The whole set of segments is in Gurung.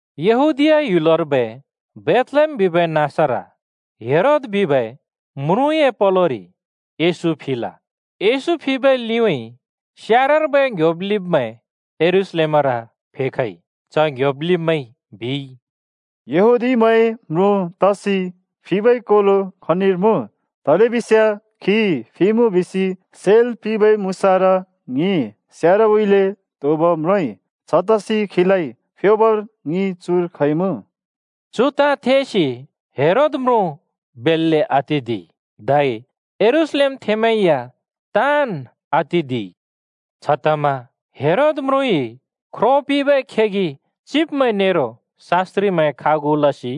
यहूदीया ह्‍युलर्बै बेथलेहेम बिबै नाँसर हेरोद बिबै म्रुँए पलोरि येशू फिल। येशू फिबै लिउँइँ स्यारर्बै ङ्‌ह्‍योब् लिब्मैं यरूशलेमर फेखइ। च ङ्‌ह्‍योब् लिब्मैंइ बिइ, “यहूदीमैंए म्रुँ तसि फिबै कोलो खनिर मुँ? तलेबिस्याँ खी फिइमुँ बिसि सेल् पिंबै मुसारा ङिइ स्यारउँइँले त्‍होंब म्रोंइ। छतसि खीलाइ फ्योबर ङि चुर खइमुँ।” चु ताँ थेसि हेरोद म्रुँ बेल्‍ले आतिदिइ धै यरूशलेमथेंमैं या ताँन् आतिदिइ। छतमा हेरोद म्रुँइ ख्रो पिंबै खेगि चिब्मैं नेरो शास्‍त्रिमैं खागु लसि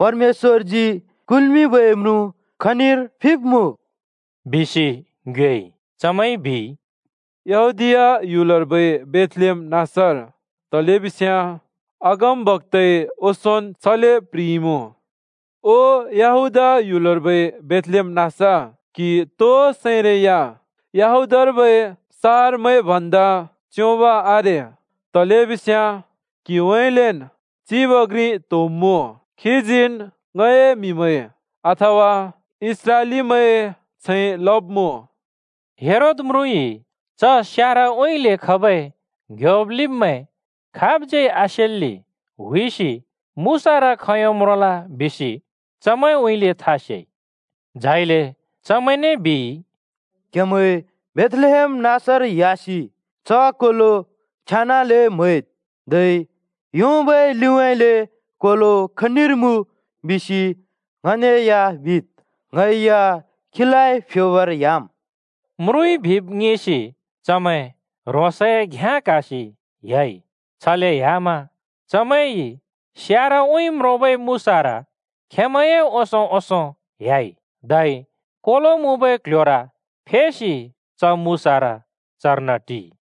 “परमेश्‍वरजी कुल्मिंबै म्रुँ खनिर फिब्मुँ?” बिसि ङ्योएइ। चमैंइ बिइ, “यहूदीया ह्‍युलर्बै बेथलेहेम नाँसर, तलेबिस्याँ अगमबक्‍ताइ ओंसोंन् छले प्‍ह्रिइमुँ: ‘ओ यहूदा ह्‍युलर्बै बेथलेहेम नाँस, क्हि तो सैरै या यहूदार्बै सहरमैं भन्दा च्‍योंब आरे। तलेबिस्याँ क्हिउँइँलेन् चिब घ्रि त्‍होंब्‍मुँ। खीजीन् ङए म्‍हिमैं अथवा इस्राएलीमैंए छैं लब्‍मुँ।’” च्हमा हेरोद म्रुँइ च स्यारउँइँले खबै ङ्‌ह्‍योब् लिब्मैं खाबज्यै आसेल्‍ले हुइसि मुसारा खोंयों म्रोंल बिसि चमैंउँइँले था सेइ। झाइले चमैंने बिइ, “क्‍हेमैं बेथलेहेम नाँसर ह्‍यासि च कोलो छेन्‍ले म्‍हैद्, धै योंबै लिउँइँ कोलो खनिर मुँ बिसि ङने या बिद्। ङै या खीलाइ फ्योबर ह्‍याम्।” म्रुँइ बिब् ङिसि चमैं ह्रोंसए घ्याँ क्‍हासि ह्‍याइ। छले ह्‍याम चमैंइ स्यारउँइँ म्रोंबै मुसार खेंमैंए ओंसों-ओंसों ह्‍याइ। धै कोलो मुँबै क्ल्ह्‍योर फेसि च मुसारा चर्न टिइ।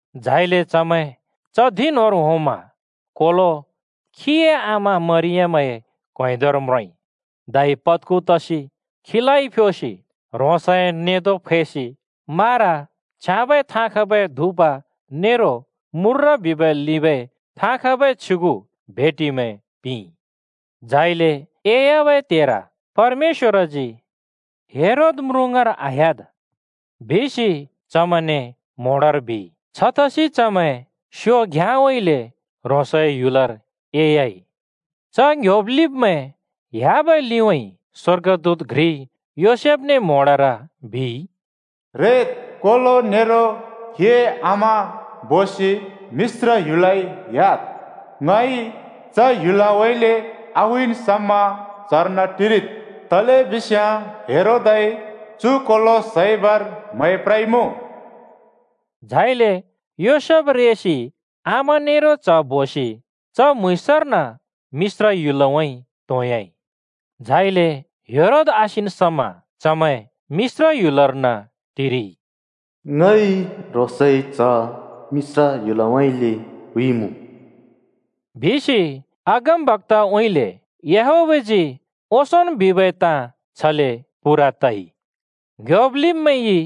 झाइले चमैं च धिं न्‍होंर होंमा कोलो खीए आमा मरियमए क्‍वेंदर म्रोंइ। धै पत्खु तसि खीलाइ फ्योसि ह्रोंसए नेंदो फैसि मारा, छ्याँबै थाँ खबै धुप नेरो मूर्र बिबै लिंबै थाँ खबै छ्युगु भेटिमैं पिंइ। झाइले एह्‍याबै त्हेर परमेश्‍वरजी “हेरोद म्रुँ ङाँर आह्‍याद्,” बिसि चमैंने म्होंडर बिइ। छतसि चमैं स्योबै घ्‍याँउँइँले ह्रोंसए ह्‍युलर एह्‍याइ। च ङ्‌ह्‍योब् लिब्मैं ह्‍याबै लिउँइँ स्‍वर्गदूत घ्रिइ योसेफने म्‍होंडर बिइ, “रेद्, कोलो नेरो खीए आमा बोसि मिश्र ह्‍युलउँइँ ह्‍याद्। ङइ च ह्‍युलउँइँले आहुइन् समा चर्न टिरिद्, तलेबिस्याँ हेरोदइ चु कोलो सैबर म्है प्रइमुँ।” झाइले योसेफ रेसि आमा नेरो च्ह बोसि च म्‍हुँइँसर्न मिश्र ह्‍युलउँइँ त्होंयाइ। झाइले हेरोद आसिन् समा चमैं मिश्र ह्‍युलर्न टिरिइ। “ङइ ह्रोंसए च्‍ह मिश्र ह्‍युलउँइँले हुइमुँ।” बिसि अगमबक्‍ताउँइँले याहवेहजी ओंसोंन् बिबै ताँ छले पूरा तइ। ङ्‌ह्‍योब् लिब्मैंइ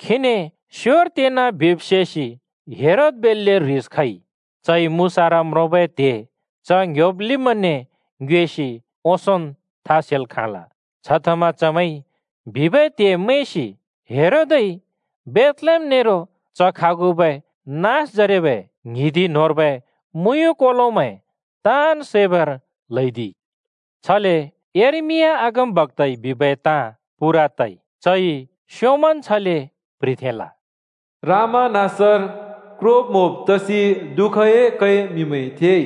खीने स्योर तेना बिब् सेसि हेरोद बेल्‍ले ह्रिस खइ। चइ मुसारा म्रोंबै त्हे च ङ्‌ह्‍योब् लिब्मैंने ङ्योएसि ओंसोंन् था सेल् खाँल। छतमा चमैंइ बिबै त्हे मैंसि हेरोदइ बेथलेहेम नेरो च खागुबै नाँसजरेबै ङ्हिंदि न्होंर्बै मुँयुँ कोलोमैं ताँन् सैबर ल्‍हैदिइ। छले यर्मिया अगमबक्‍ताइ बिबै ताँ पूरा तइ। चइ स्‍योंमन् छले प्‍ह्रिथेंल: “रामा नाँसर क्रोब्-म्‍होब् तसि दुःखए कै म्‍हिमैंइ थेइ।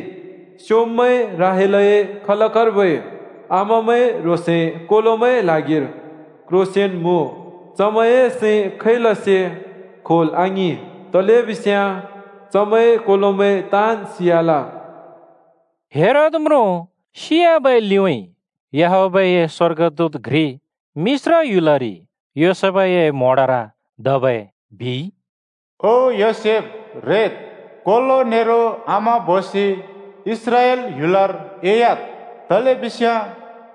स्‍योंम्‍बै राहेलए खलकर्बै आमामैं ह्रोंसए कोलोमैंए ल्हागिर क्रोसेन् मुँ। चमैंए सैं खैलसे क्‍होल् आङिं। तलेबिस्याँ चमैंए कोलोमैं ताँन् सियाल।” हेरोद म्रुँ सियाबै लिउँइँ याहवेहए स्‍वर्गदूत घ्रि मिश्र ह्‍युलरि योसेफए म्‍होंडर धबै बिइ। “ओ योसेफ, रेद्, कोलो नेरो आमा बोसि इस्राएल ह्‍युलर एह्‍याद्। तलेबिस्याँ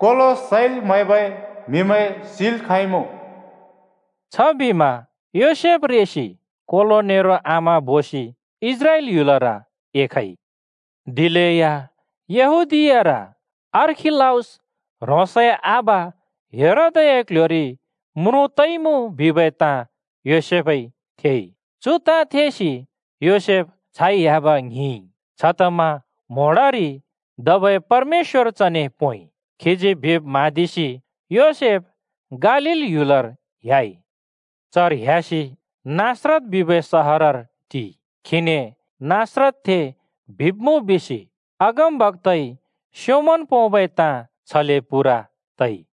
कोलो सैल् म्‍हैबै म्‍हिमैं सिल् खाँइमुँ।” छबिमा योसेफ रेसि कोलो नेरो आमा बोसि इस्राएल ह्‍युलर एखइ। दिलेया यहूदीयार अर्खिलाउस ह्रोंसए आबा हेरोदए क्‍ल्‍ह्‍योरि म्रुँ तइमुँ बिबै ताँ योसेफइ थेइ। चु ताँ थेसि योसेफ छाइ ह्‍याब ङ्हिंइ। छतमा म्‍होंडरि धबै परमेश्‍वर चने पोंइ। खीजी बिब् म्हाँदिसि योसेफ गालील ह्‍युलर ह्‍याइ। चर ह्‍यासि नासरत बिबै सहरर टिइ। खीने नासरतथें बिब्‍मुँ बिसि अगमबक्‍ताइ स्‍योंमन् पोंबै ताँ छले पूरा तइ।